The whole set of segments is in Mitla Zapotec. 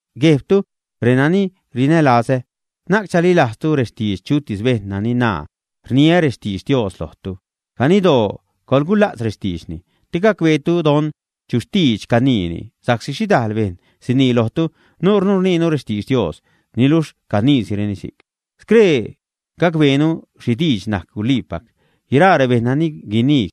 Guejbtu renani rinälazä, na'c chalilajztu rextidx chutis bejṉ nani naa, “rniä rextidx Dios lojtu”. Ganiddoo coḻgula'tz rextiidxni te gacbeetu don chu xtidx caniini, sa'csi xhidajl bejṉ sinii lojtu, “nuunu rniinu rextidx Dios”, niluxh caniisireni si'c. Scree gacbeenu xhi diidx najc guliipac. Guiraa rebejṉ nani guinii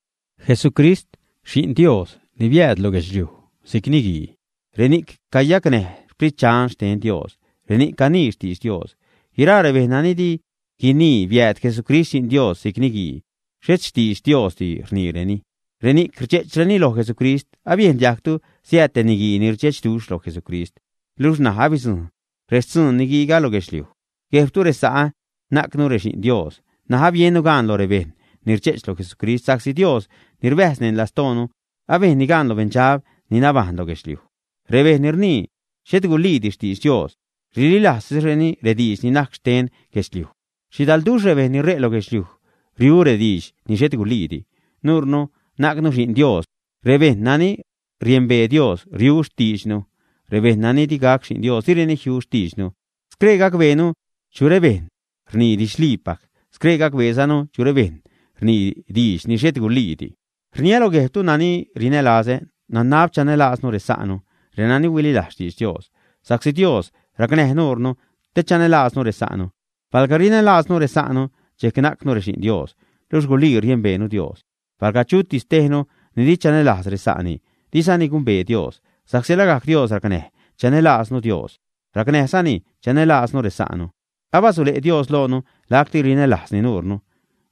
“Jesucrist, Xi'n Dios, ni biääd lo guedxliuj si'c niguii”, reni'c cayacnäj Sprit Dxan xten Dios, reni'c canii xtidx Dios. Guiraa rebejṉ nani di guinii biääd Jesucrist Xi'n Dios si'c niguii, xhet xtidx Diosdi rniireni. Reni'c rdxe'chreni loj Jesucrist. Abiejn diajgtu siääd te niguii ni rdxechduxh loj Jesucrist, luxh ṉaj abidzujṉ rextzuun niguiiga lo guedxliuj. Guejbtu resa'ä, najcnu rexi'n Dios. N̲aj abiennu gaan lo rebejṉ ni rdxe'ch lo Jesucrist sa'csi Dios ni rbäjz neṉ lastoonu abejnni gaan lo beṉdxab ni nabajṉ lo guedxliuj. Rebejṉ ni rnii xhet guliidi xtidx Dios, rililajztisreni rediidx ni najc xten guedxliuj. Xhidalduxh rebejṉ ni ṟe' lo guedxliuj riu rediidx ni xhet guliidi. Nuunu najcnu xi'n Dios. Rebejṉ nani riembee Dios riu xtiidxnu. Rebejṉ nani di gac xi'n Dios direni jiu xtiidxnu. Scree gacbeenu chu rebejṉ rnii didxliipac. Scree gacbeezanu chu rebejṉ rnii diidx ni xhet guliidi. Rniä lo guejbtu nani rinälazä, nanab chanälaaznu resa'nu, renani huililajz xtidx Dios, sa'csi Dios racnäj nuunu te chanälaaznu resa'nu. Palga rinälaaznu resa'nu, dxejc najcnu rexi'n Dios, luxh gulii riembeenu Dios. Palga chutis tejnu di chanälajz resa'ni, dizani gumbee Dios, sa'csi lagajc Dios racnäj chanälaaznu Dios, racnäjzani chanälaaznu resa'nu. Abasule' Dios loonu lacti rinälajzni nuunu.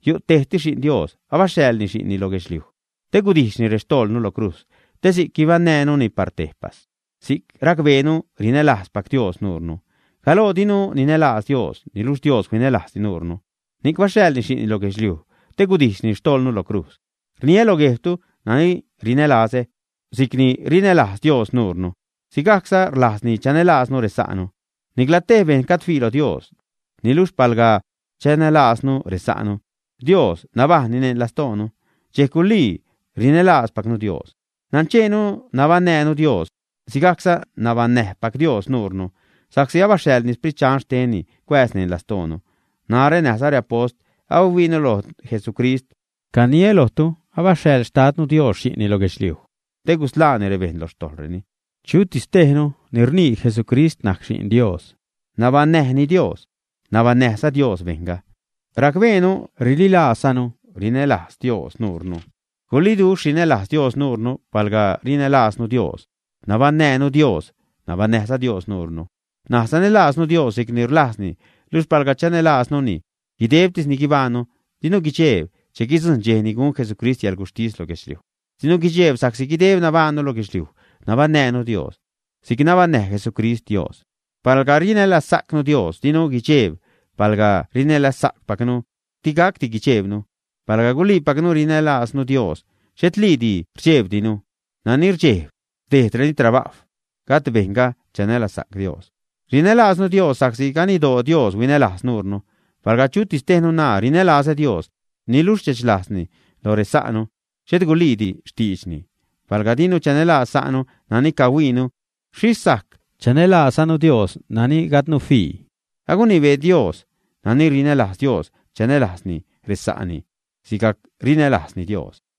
Yu' tejtis Xi'n Dios. Abaxhaḻni Xi'nni lo guedxliuj te gudijxni rextojḻnu lo crujz te si'c guibaṉnäjnuni par tejpas. Si'c racbeenu rinälajzpac Dios nuunu. Galoo dinu ninälajz Dios. Niluxh Dios huinälajz nuunu, ni'c baxhaḻni Xi'nni lo guedxliuj te gudijxni xtojḻnu lo crujz. Rniä lo guejbtu nani rinälazä, si'cni rinälajz Dios nuunu, sigajcza rlajzni chanälaaznu resa'nu. Nicla tej bejṉ gajd fii lo Dios. Niluxh palga chanälaaznu resa'nu, Dios nabajṉ neṉ lastoonu, dxejc gulii rinälaazpacnu Dios. Nancheenu nabaṉnäjnu Dios, sigajcza nabaṉnäjpac Dios nuunu, sa'csi abaxhaḻni Sprit Dxan xtenni cuääz neṉ lastoonu. Narä näjza reapost abahuiinu loj Jesucrist. Caniä lojtu abaxhaḻ Xtadnu Dios Xi'nni lo guedxliuj te gusḻaani rebejṉ lo xtojḻreni. Chutis tejnu ni rnii “Jesucrist najc Xi'n Dios”, nabaṉnäjni Dios, nabaṉnäjza Dios bejṉga. Racbeenu, rililaazzanu rinälajz Dios nuure. Guliduxh rinälajz Dios nuunu. Palga rinälaaznu Dios, nabaṉnäjnu Dios, nabaṉnäjza Dios nuunu. N̲aj sanälaaznu Dios si'cni rlajzni luxh palga chanälaaznuni guidebtis ni guibajṉnu, dinu guidxejb che guidzujṉ dxej ni gun Jesucrist yäḻguxhtis lo guedxliuj. Dinu guidxejb sa'csi guideb nabajṉnu lo guedxliuj, nabaṉnäjnu Dios si'c nabaṉnäj Jesucrist Dios. Palga rinälazsa'cnu Dios, dinu guidxejb, palga rinälajzpacnu di gacdi guidxeebnu. Palga guliipacnu rinälaaznu Dios, xhetliidi rdxejbdinu. Nani rdxejb, rdejdni trabajw, gajd bejṉga chanälazsa'c Dios. Rinälaaznu Dios sa'csi ganiddoo Dios huinälajz nuunu. Palga chutis tejnu naa “rinälazä Dios” niluxh rdxechlajzni lo resa'nu, xhet guliidi xtiidxni. Palga dinu chanälajz sa'nu nani cahuiinu, xhixh sajc chanälaazzanu Dios nani gajdnu fii. Agunibee Dios, nani rinälajz Dios chanälajzni resa'ni sigajc rinälajzni Dios.